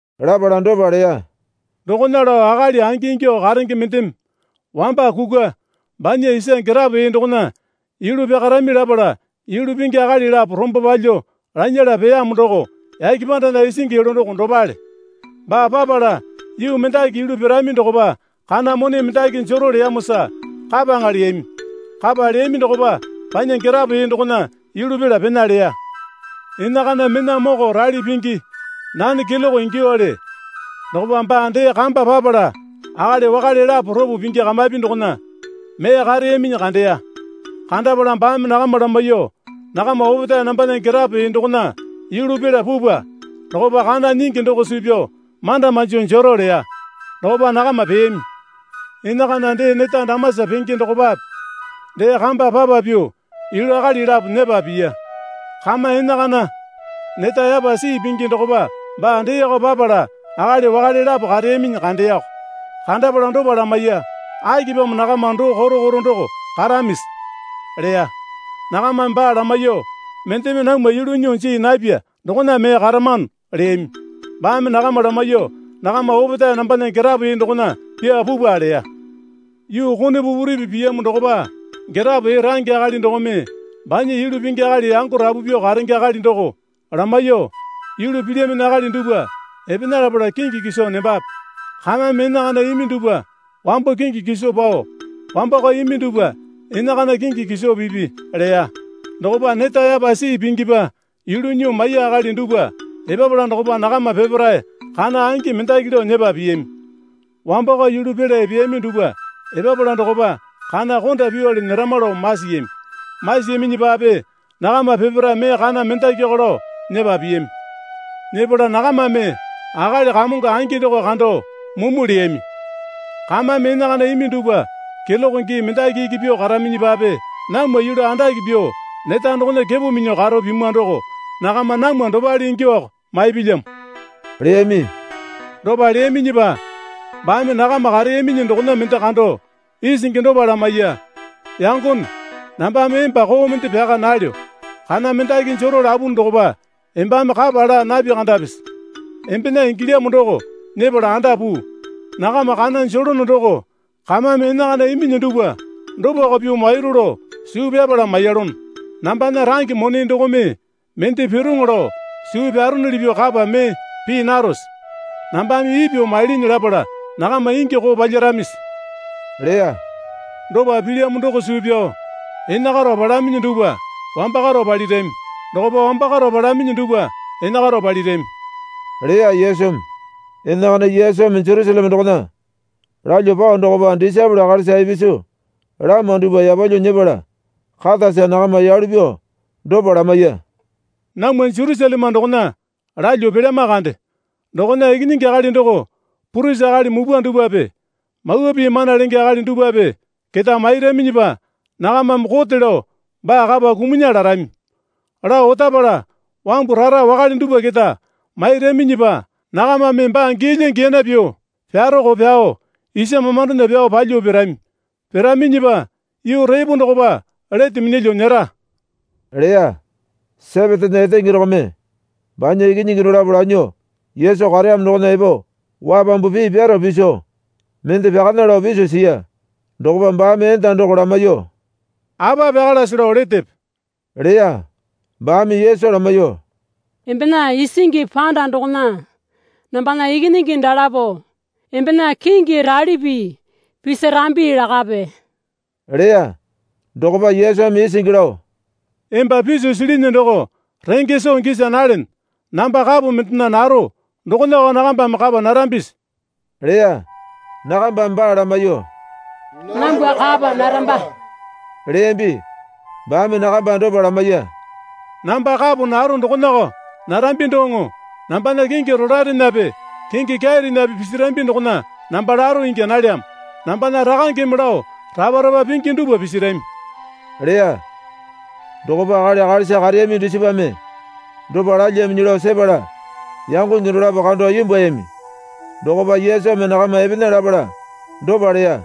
Lapala dopa leya. Dokona lao akali angingyuo karenge mendeme wamba kukwa banya isa girapo ee dokona yulu pyakarami lapala yulu pingi akali lapo rombo palyuo lanyala peyamo doko yake pandana isingi yulu doko dopale. Baa papala yuu mendaki yulu pirami dokopa kana mone mendaki jero leyamosa kapaŋa leyami. Kapa leyami dokopa banya girapo ee dokona yulu pela pena leya. Enakana mena moko rali pingi (nane keloke ingyuowale) dokopa baa dee kamba papala akali wakale lapo ropo pingi kamapi dokona mee kareyaminyi kandeya. Kandapala baame nakama lamaiyuo, Nakama opetae nambana girapo ee dokona yulu pela pupwa. Dokopa kana nyingi doko suu pyao manda manjo jero, leya. Dokopa nakama peyami. Enakana dee neta damasa penge dokopape dee kamba papa pyuo yulu akali lapo nyepa piya. Kama enakana neta yapa sii pingi dokopa baa deeko papala akali wakale lapo kareyaminyi kandeyako. Kandapala dopa lamaiya. Akipamo nakama doo koto koto doko karamisi? leya. Nakamame baa lamaiyuo, Mendeme namwa yulu nyuo jii napya dokona mee karamano, leyami. Baame nakama lamaiyuo, Nakama opetae nambana girapo ee dokona pyaa pupwa, leya. Yuu kone pupuripi piyamo dokopa girapo ee range akali dokome banya yulu pingi akali yango rapu pyuo karenge akali doko lamaiyuo, Yulu pilyaminyi akali dupwa epena lapala kingi kiso nembape. Kamame enakana imi dupwa wambo kingi kiso pao wambakao imi duwpa enakana kingi kiso pipi, leya. Dokopa neta yapa sii pingipa yulu nyuo maiya akali dupwa epapala dokopa nakama peparae kana angi mendaki lao nyepa piyami. Wambakao yulu pela epeyami dupwa epapala dokopa kana konda pyuwale nyerama lao masiyami. Masiyaminyipape nakama peparae mee kana mendakiko lao nyepa piyami. Nyepala nakamame akali kamongo angi doko kando mumu leyami. Kamame enakana imi dupwa keloke gii mendaki iki pyuo karaminyipape namwa yulu andake pyuo neta dokona kepo minyuo karo pimwa doko nakama namwa dopale ingyuowako maipilyamo, leyami. Dopa leyaminyipa baame nakama kareyaminyi dokona mende kando isingi dopa lamaiya. Yangone nambame emba koo mende pyaka nalyo. Kana mendaki jero lapunu dokopa embame kapa laa napi kandapisi? Embena ingilyamo doko nyepala anda puu. Nakama kana jelono doko kamame enakana iminyi dupwa dopako pyuo mairu lao suu pyapala maiyalono. Nambana range mone dokome mende piroŋo lao suu pyaronuli pyuo kapa mee pii narose? Nambame ipyuo mailinyi lapala nakama ingi koo palyaramisi? leya. Dopa pilyamo doko suu pyao enakaro palaminyi dupwa wambakaro palirami. Dokopa wambakaro palaminyi dupwa enakaro palirami, leya Yesumi. Enakana Yesumi Jerusaleme dokona lalyuo pao dokopa disaepole akalisa ipisu lama dupwa yapalyuo nyepala katasa nakama yalu pyuo dopa lamaiya. Namwa Jerusaleme dokona lalyuo pelyama kande. Dokona Ikinyingi Akali doko purisi akali mupwa dupwape mawa pii mana lenge akali dupwape keta mairaminyipa nakamame kote lao baa kapa kumunya larami. Lao otapala wambu rara wakale dupwa keta mairaminyipa nakamame baa giyalya giyana pyuo pyaroko pyao isa mamandona pyao palyuo pirami. Piraminyipa yuu repo dokopa lete minyalyuo nyera, leya. Sepetena etenge dokome banya ikinyingi dolapo lanyuo Yesu kareyamo dokona epo wapambu pii pyaro piso mende pyakana lao piso siya. Dokopa baame enda doko lamaiyuo, Apa pyakalase lao letepe? leya. Baame Yesu lamaiyuo, Embena isingi panda dokona nambana ikinyingi dalapo embena kingi ralipi pisirambi lakape, leya. Dokopa Yesumi isingi lao, Emba piso silinyi doko renge soo gisa nalene. Namba kapo mendena naro dokonako nakambame kapa narambisi? leya. Nakambame baa lamaiyuo, Nambwa kapa naramba, leyambi. Baame nakamba dopa lamaiya. Namba kapo naro dokonako narambi doŋo nambana kingi rolaerenape kingi kyairenape pisirambi dokona namba laro ingya nalyamo. Nambana Rakangeme lao rapa rapa pingi dupwa pisirami, leya. Dokopa akali akalisa kareyami dusipame dopa lalyambinyi lao sepala yangonge dolapo kando imbwuayami. Dokopa Yesumi nakama epena lapala dopa leya.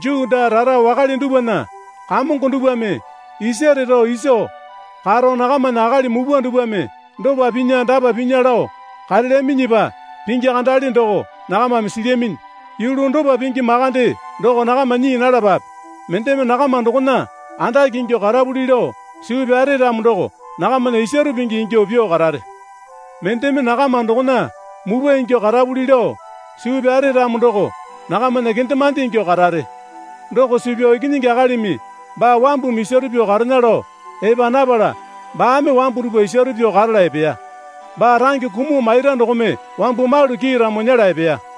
Juu daa rara wakale dupwana kamongo dupwame isare rao iso karo nakamana akali mupwa dupwame dopa pinya dapa pinya lao karelyaminyipa pingi kandale doko nakamame silyaminyi. Yulu dopa pingi makande doko nakama nyii nalapape. Mendeme nakama dokona andake ingyuo karapuli lao suu pyare ramo doko nakamana isaro pingi ingyuo pyuo karare. Mendeme nakama dokona mupwa ingyuo karapuli lao suu pyare ramo doko nakamana kendemande ingyuo karare. Doko suu pyao Ikinyingi Akalimi baa wambumi isaro pyuo karena lao epa napala baame wambu dupwa isaro pyuo karala epeya. Baa range kumuo maira dokome wambu malu kiiramo nyela epeya.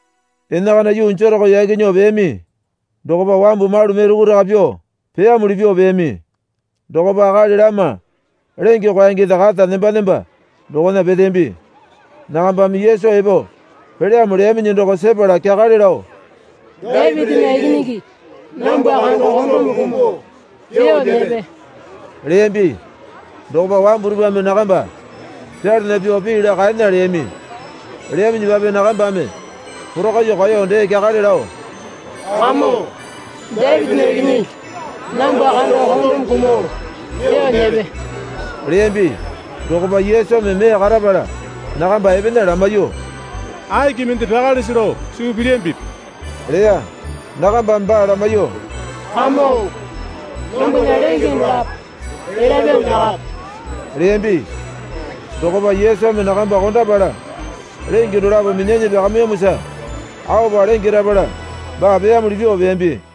Enakana yuu Jereko yaki nyuo peyami dokopa wambu malu mee rukuraka pyuo peyamuli pyuo peyami. Dokopa akali lama lenge kwaengende kata nemba nemba dokona peteyambi. Nakambame Yesu epo pelyamo leyaminyi doko sepala kyakale lao, Dapitinya Ikinyingi, nambwa kando kondome kumuo pyuo nyepe, leyambi. Dokopa wambu dupwame nakamba pyalana pyuo pii laa kaena leyami. Leyaminyipape nakambame porakaiyuo kaeyo dee kyakale lao, Kamongo, Dapitinya Ikinyingi, nambwa kando kondome kumuo pyuo nyepe, leyambi. Dokopa Yesumi mee karapala nakamba epena lamaiyuo, Aki mende pyakalese lao suu pilyambipi? leya. Nakambame baa lamaiyuo, Kamongo, nambwana lenge dolapo elya pyuo nyakape, leyambi. Dokopa Yesumi nakamba kondapala lenge dolapo minyanyi pyakamiyamosa aopa lenge rapala baa peyamuli pyuo peyambi.